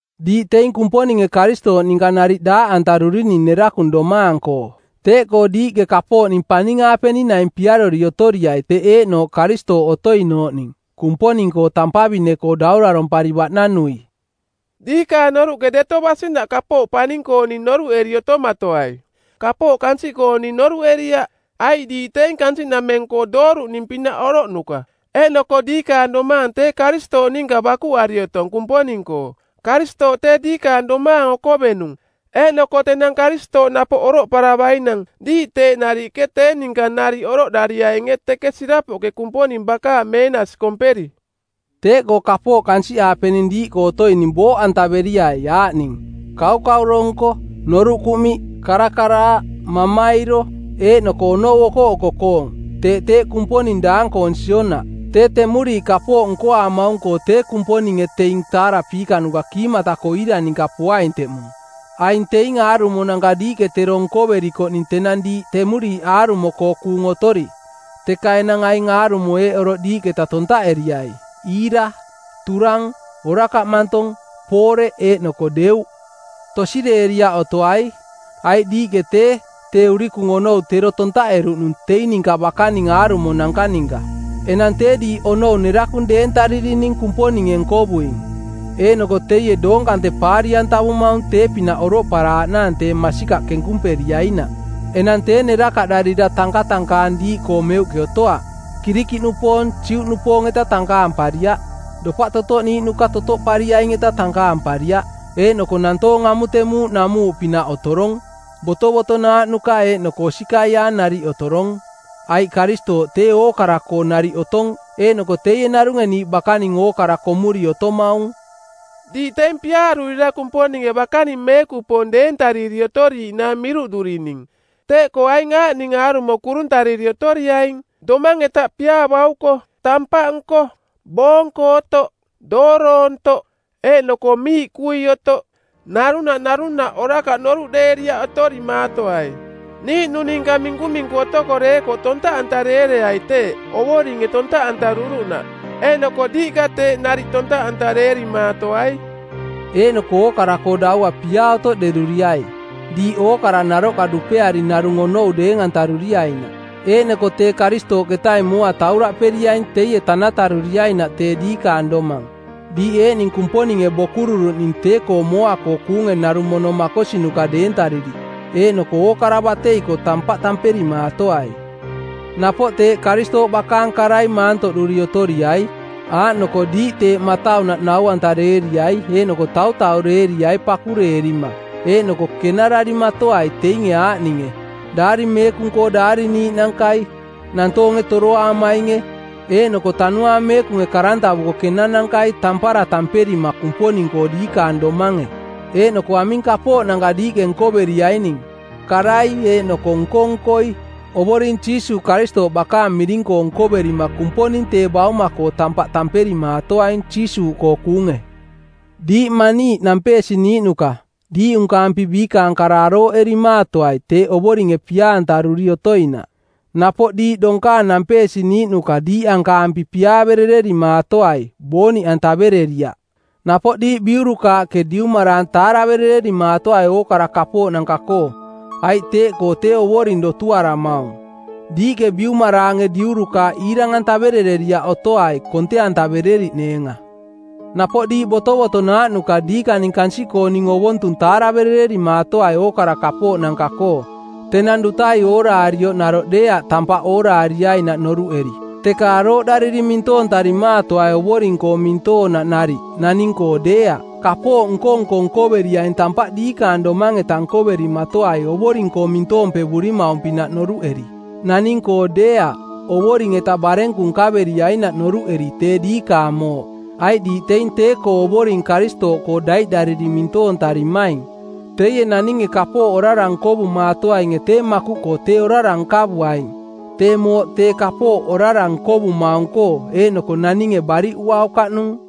Diiꞌ teing Kumponinge Karistooꞌ ninka nariꞌ daaꞌantarurining nerakung domaang-koo. Teeꞌkoo diiꞌke kapooꞌning paning-aapening naing piarori otoriai teꞌ eeꞌnooꞌ Karistooꞌ otoinooꞌning, Kumponing-koo tampavine-koo daurarompari baꞌnanui. Diikaang noruꞌke deto basinaꞌ kapooꞌ paning-kooning noruꞌeri otomatoai, kapooꞌ kansiꞌkooning noruꞌeriaꞌ. Aiꞌ diiꞌ teing kansiꞌnameng-koo dooruꞌning pinaꞌ oroꞌnuka, eeꞌnoko diikaang domaang tee Karistooꞌ ninka bakuꞌari otong Kumponing-koo. Karistooꞌ tee diikaang domaang okovenung, eeꞌnoko tenang Karistooꞌ napoꞌ oroꞌparavainang diiꞌ teeꞌ nariꞌke tee ninka nariꞌ oroꞌdariainge teke sirapoꞌke Kumponing bakaang meenasi komperi. Teeꞌkoo kapooꞌ kansiꞌaapening diiꞌkoo otoining booꞌantaveriai aaꞌning: kaukauro nko, noruꞌ kuꞌmiꞌ, karakaraaꞌ, mamairo, eeꞌnoko onou okoꞌoko-koong, teeꞌ teeꞌ kumponing daang-koong sionaꞌ. Tee temuriiꞌ kapooꞌ nkoaamaung-koo tee Kumponinge teing taarapiikanuka kiimata-koo iira ninka poaing teꞌmung. Aing teing aarumonanka diiꞌke tero nkoverikoꞌning tenang diiꞌ temuriiꞌ aarumo-koo kuung otori. Teka enang aing aarumo eeꞌ oroꞌ diiꞌketa tontaꞌeriai: iira, turang, orakaꞌ mantong, pooreꞌ eeꞌnoko deuꞌ. Tosireeriaꞌ otoai, aiꞌ diiꞌke tee, tee urikung onou tero tontaꞌeruꞌnung teing ninka bakaning aarumonanka ninka. Enang tee diiꞌ onou nerakung deentaririning Kumponinge nkovuing, eeꞌnoko teie doong kante paari-antavumaung tee-pinaꞌ oroꞌparaaꞌnaang tee masikaꞌ kenkumperiainaꞌ. Enang tee nerakaꞌdarira tankatankaang diiꞌkoo meuꞌke otoaꞌ. Kirikiꞌnupoong, Juꞌnupoong-eta tankaampariaꞌ, dopaꞌ totoꞌniiꞌnuka totoꞌpariaing-eta tankaampariaꞌ. Eeꞌnoko nantoong amutemuuꞌ namuuꞌpinaꞌ otorong. Botovotonaaꞌnuka eeꞌnoko osikaiaang nariꞌ otorong – aiꞌ Karistooꞌ tee ookara-koo nariꞌ otong eeꞌnoko teie narunge niiꞌ bakaning ookara komuri otomaung. Diiꞌ teing piaarurira Kumponinge bakaning meekupoong deentariri otoriiꞌnaang miruꞌdurining. Teeꞌkoo aing aaꞌning aarumo kuruntariri otoriaing: domang-eta piaa bauko, tampaꞌnko, boonko otoꞌ, dooroontoꞌ, eeꞌnoko miiꞌkui otoꞌ. Narunaꞌ narunaꞌ orakaꞌ noruꞌdeeriaꞌ otorimaatoai. Niiꞌnung ninka minkuminku otoko deekoꞌ tontaꞌantareereai teeꞌ Ovoringe tontaꞌantaruruꞌnaꞌ, eeꞌnoko diiꞌka teeꞌ nariꞌ tontaꞌantareerimaatoai. Eeꞌnoko ookara-koo daua piaa otoꞌderuriai, diiꞌ ookara naroꞌka dupeari narung onou deeng-antaruriainaꞌ. Eeꞌnoko tee Karistooꞌketaing mooa tauraꞌperiaing teie tanataruriainaꞌ tee diikaang domang, diiꞌ eeꞌning Kumponinge bokururuꞌning tee-koo mooa-koo kuunge narung mono makosinuka deentariri, eeꞌnoko ookara batei-koo tampaꞌ tamperimaatoai. Napoꞌ teeꞌ Karistooꞌ bakaang karai maantoꞌduri otoriai, aaꞌnoko diiꞌ tee mataunaꞌ nau-antareeriai eeꞌnoko tautaureeriai pakureerima, eeꞌnoko kenararimatoai teinge aaꞌninge: Daari Meekung-koo daariniiꞌnankai, nantoonge toroaamainge eeꞌnoko Tanuaang Meekunge karantavuko˜ kenanankai tampara tamperima Kumponing-koo diikaang domange. Eeꞌnoko aming kapooꞌnanka diiꞌke nkoveriaining, karai eeꞌnoko nko-nkoi, Ovoring Jiisuuꞌ Karistooꞌ bakaang miring-koo nkoverima Kumponing tee bauma-koo tampaꞌ tamperimaatoaing Jiisuuꞌkoo kuunge. Diiꞌ maniiꞌ nampeesiniiꞌnuka, diiꞌunkaampi biikaang kara arooꞌerimaatoai teeꞌ Ovoringe pia-antaruri otoinaꞌ. Napoꞌ diiꞌ donkaang nampeesiniiꞌnuka diiꞌankaampi piaaverererimaatoai booniꞌ antavereriaꞌ. Napoꞌ diiꞌ biurukaaꞌke diumaraang taaraverererimaatoai ookara kapooꞌnanka-koo, aiꞌ teeꞌkoo tee Ovoring dotuaramaung. Diiꞌke biumaraange diurukaaꞌ iirang-antaverereriaꞌ otoai konte-antavereriꞌneenga. Napoꞌ diiꞌ botovotonaaꞌnuka diikaning kansiꞌkooning ovontung taaraverererimaatoai ookara kapooꞌnanka-koo, tenang dutai ooraarioꞌ naroꞌ deeaꞌ tampaꞌ ooraariainaꞌ noruꞌeri, teka arooꞌdariri mintoontarimaatoai Ovoring-koo mintoonaꞌ nariꞌ, naning-koo deeaꞌ. Kapooꞌ nko-nko nkoveriaing tampaꞌ diikaang domang-eta nkoverimatoai Ovoring-koo mintoompevurimaung-pinaꞌ noruꞌeri, naning-koo deeaꞌ, Ovoring-eta barenku nkaveriainaꞌ noruꞌeri tee diikaang mooꞌ; Aiꞌ diiꞌ teing tee-koo Ovoring Karistooꞌkoo daiꞌdariri mintoontarimaing. Teie naninge kapooꞌ orara nkovumaatoainge tee makuꞌnooꞌkoo tee orara nkavuaing, tee mooꞌ tee kapooꞌ orara nkovumaung-koo eeꞌnoko naninge baariꞌuaukaꞌnung.